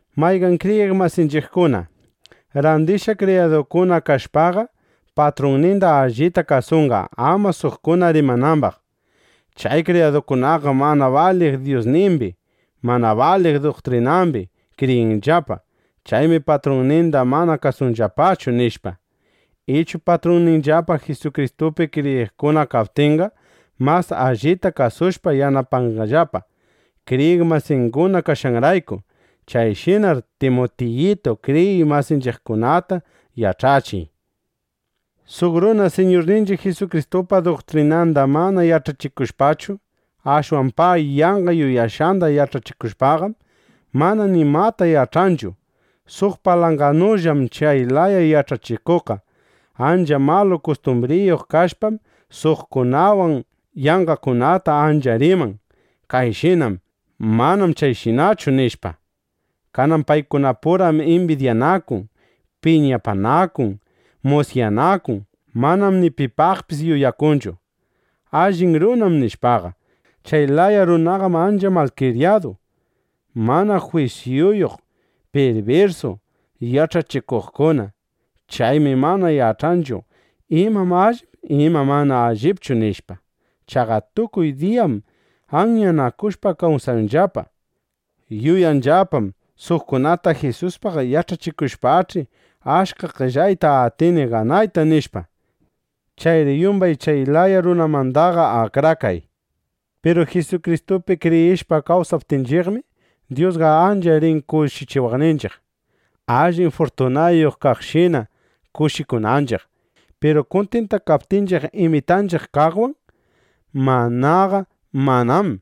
Mayqan kriyiq masinchiqkuna, randishqa kriyadukuna kashpaqa, patrunninda allita kasunqa, ama suqkuna rimanambaq: “Chay kriyadukunaqam mana baliq Dyusnimbi, mana baliq duktrinambi kriyinllapa. Chaymi patrunninda mana kasunllapachu”, nishpa. Ichu patrunninllapa Jisukristupi kriyiqkuna kaptinqa, mas allita kasushpa yanapanqallapa, kriyiq masinguna kashqanrayku. Chayshinar, Timutiyitu, kriyiq masinchiqkunata yach'achiy. Suq runa Siñurninchiq Jisukristupa duktrinanda mana yach'achikushpachu, ashwan pay yanqa yuyashqanda yach'achikushpaqam, mana nimata yach'anchu. Suq palanganullam chay laya yach'achikuqqa. Ancha malu kustumbriyuq kashpam, suqkunawan yanqakunata ancha riman: Kayshinam. Manam chayshinachu, nishpa. Kanan paykunapuram imbidyanakun, piñapanakun musyanakun. Manam ni pipaqpis yuyakunchu: Allin runam nishpaqa. Chay laya runaqam ancha malkriyadu, mana jwisyuyuq, pirbirsu yach'achikuqkuna. Chaymi mana yach'anchu: Imam allip, imam mana allipchu, nishpa. Chaqa tukuy diyam anyanakushpa kawsanllapa. Yuyanllapam: Suqkunata Jisuspaq yach'achishpaqach'i, achka qellayta atini ganayta, nishpa. Chayri yumbay chay laya runamandaqa akrakay. Piru Jisukristupi kriyishpa kawsaptinchiqmi, Dyusqa ancha rin kushichiwaqninchiq, allin furtunayuq kaqshina kushikunanchiq; piru kuntintakaptinchiq imitanchiq kaqwan; manaqa manam.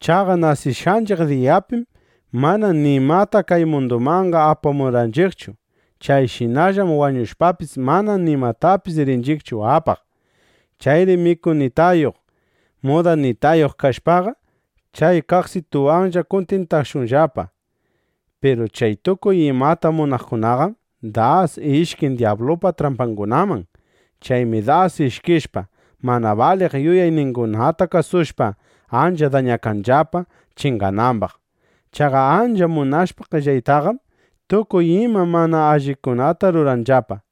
Chaqa nasishqanchiq diyapim mana nimata kay mundumanqa apamurqanchiqchu. Chayshinallam wañushpapis, mana nimatapis rinchiqchu apaq. Chayri mikunitayuq, mudanitayuq kashpaqa, chay kaqsituwanlla kuntintakashunllapa. Piru chay tukuy imata munaqkunaqam das ishkin dyablupa trampangunaman. Chaymi das ishkishpa, mana baliq yuyayningunata kasushpa, ancha dañakanllapa, chinganambaq. Chaqa ancha munashpa qellaytaqam, tukuy ima mana allikunata ruranllapa.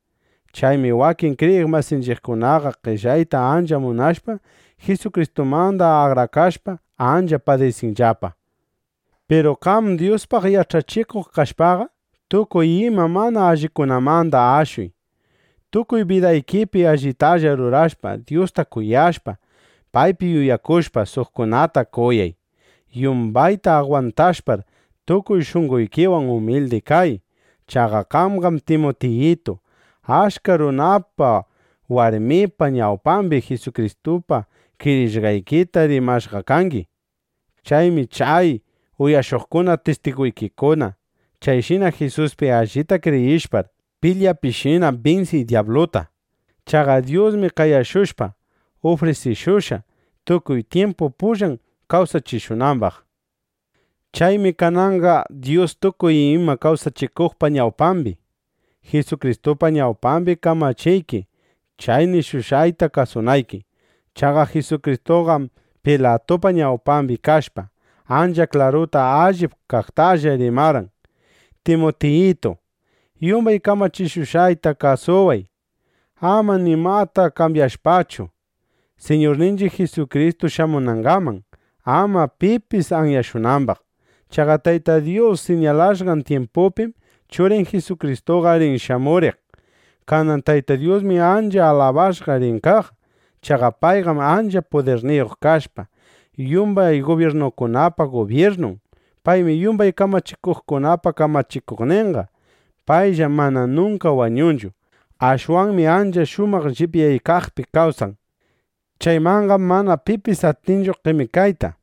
Chaymi wakin kriyiq masinchiqkunaqa qellayta ancha munashpa, Jisukristumanda akrakashpa, ancha padisishqallapa. Piru qam Dyuspaq yach'achikuq kashpaqa, tukuy ima mana allikunamanda ashuy. Tukuy bidaykipi allitalla rurashpa, Dyusta kuyashpa, paypi yuyakushpa, suqkunata kuyay. Yumbayta agwantashpar, tukuy shunqoykiwan umildi kay. Chaqa qamqam Timutiyitu, achka runapa warmipa ñawpambi Jisukristupi kriyishqaykita rimashqa kangi. Chaymi chay uyashuqkuna tistiguykikuna. Chayshina Jisuspi allita kriyishpar, pilyapishina binsiy dyabluta. Chaqa Dyusmi qayashushpa, ufrisishushqa, tukuy tyimpu pullan kawsachishunambaq. Chaymi kananqa Dyus tukuy imata kawsachikuqpa ñawpambi, Jisukristupa ñawpambi kamachiyki chay nishushqayta kasunayki. Chaqa Jisukristuqam Pilatupa ñawpambi kashpa, ancha klaruta allip kaqtalla rimarqan. Timutiyitu, yumbay kamachishushqayta kasuway, ama nimata kambyashpachu Siñurninchiq Jisukristu shamunangaman, ama pipis anyashunambaq. Chaqa Tayta Dyus siñalashqan tyimpupim Churin Jisukristuqa rin shamuriq. Kanan Tayta Dyusmi ancha alabashqa rin kaq. Chaqa payqam ancha pudirniyuq kashpa, yumbay gubyirnukunapa gubyirnun. Paymi yumbay kamachikuqkunapa kamachikuqninqa. Payllam mana nunka wañunchu. Ashwanmi ancha shumaq llipyaykaqpi kawsan. Chaymanqam mana pipis atinchu qemikayta.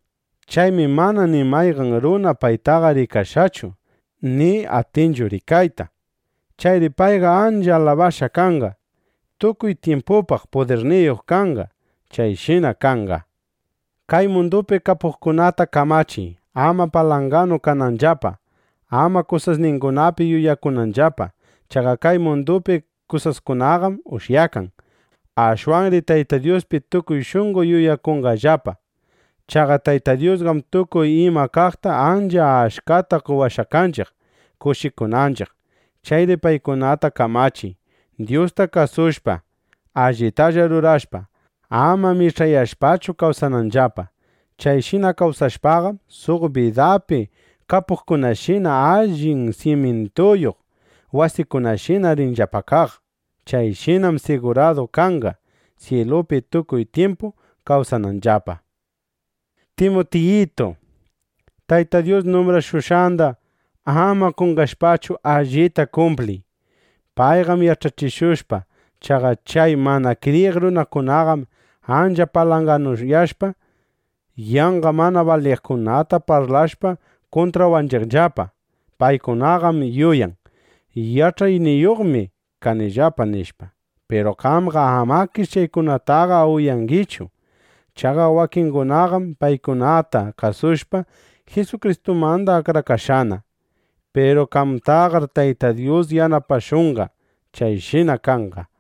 Chaymi mana ni mayqan runa paytaqa rikashqachu, ni atinchu rikayta. ¡Chayri payqa ancha alabashqa kanqa! ¡Tukuy tyimpupaq pudirniyuq kanqa! Chayshina kanqa. Kay mundupi kapuqkunata kamachiy, ama palanganu kananllapa, ama kusasningunapi yuyakunanllapa. Chaqa kay mundupi kusaskunaqam ushyakan. Ashwanri Tayta Dyuspi tukuy shunqo yuyakunqallapa. Chaqa Tayta Dyusqam tukuy ima kaqta ancha achkata qowashqa kanchiq, kushikunanchiq. Chayri paykunata kamachiy, Dyusta kasushpa, allitalla rurashpa, ama mich'ayashpachu kawsananllapa. Chayshina kawsashpaqam, suq bidapi kapuqkunashina, allin simyintuyuq wasiyuqshina rinllapa kaq. Chayshinam siguradu kanqa, syilupi tukuy tyimpu kawsananllapa. Timutiyitu, Tayta Dyus numbrashushqanda ama qonqashpachu, allita kumpliy, paypaq yach'achikushpa. Chaqa chay mana kriyiq runakunaqam ancha palanganuyashpa, yanqa mana baliqkunata parlashpa, kuntrawanchiqllapa. Paykunaqam yuyan: Yach'ayniyuqmi kanillapa, nishpa. Piru qamqa amakish chaykunataqa uyangichu. Chaqa wakingunaqam paykunata kasushpa, Jisukristumanda akrakashqana. Piru qamtaqar Tayta Dyus yanapashunqa. Chayshina kanqa.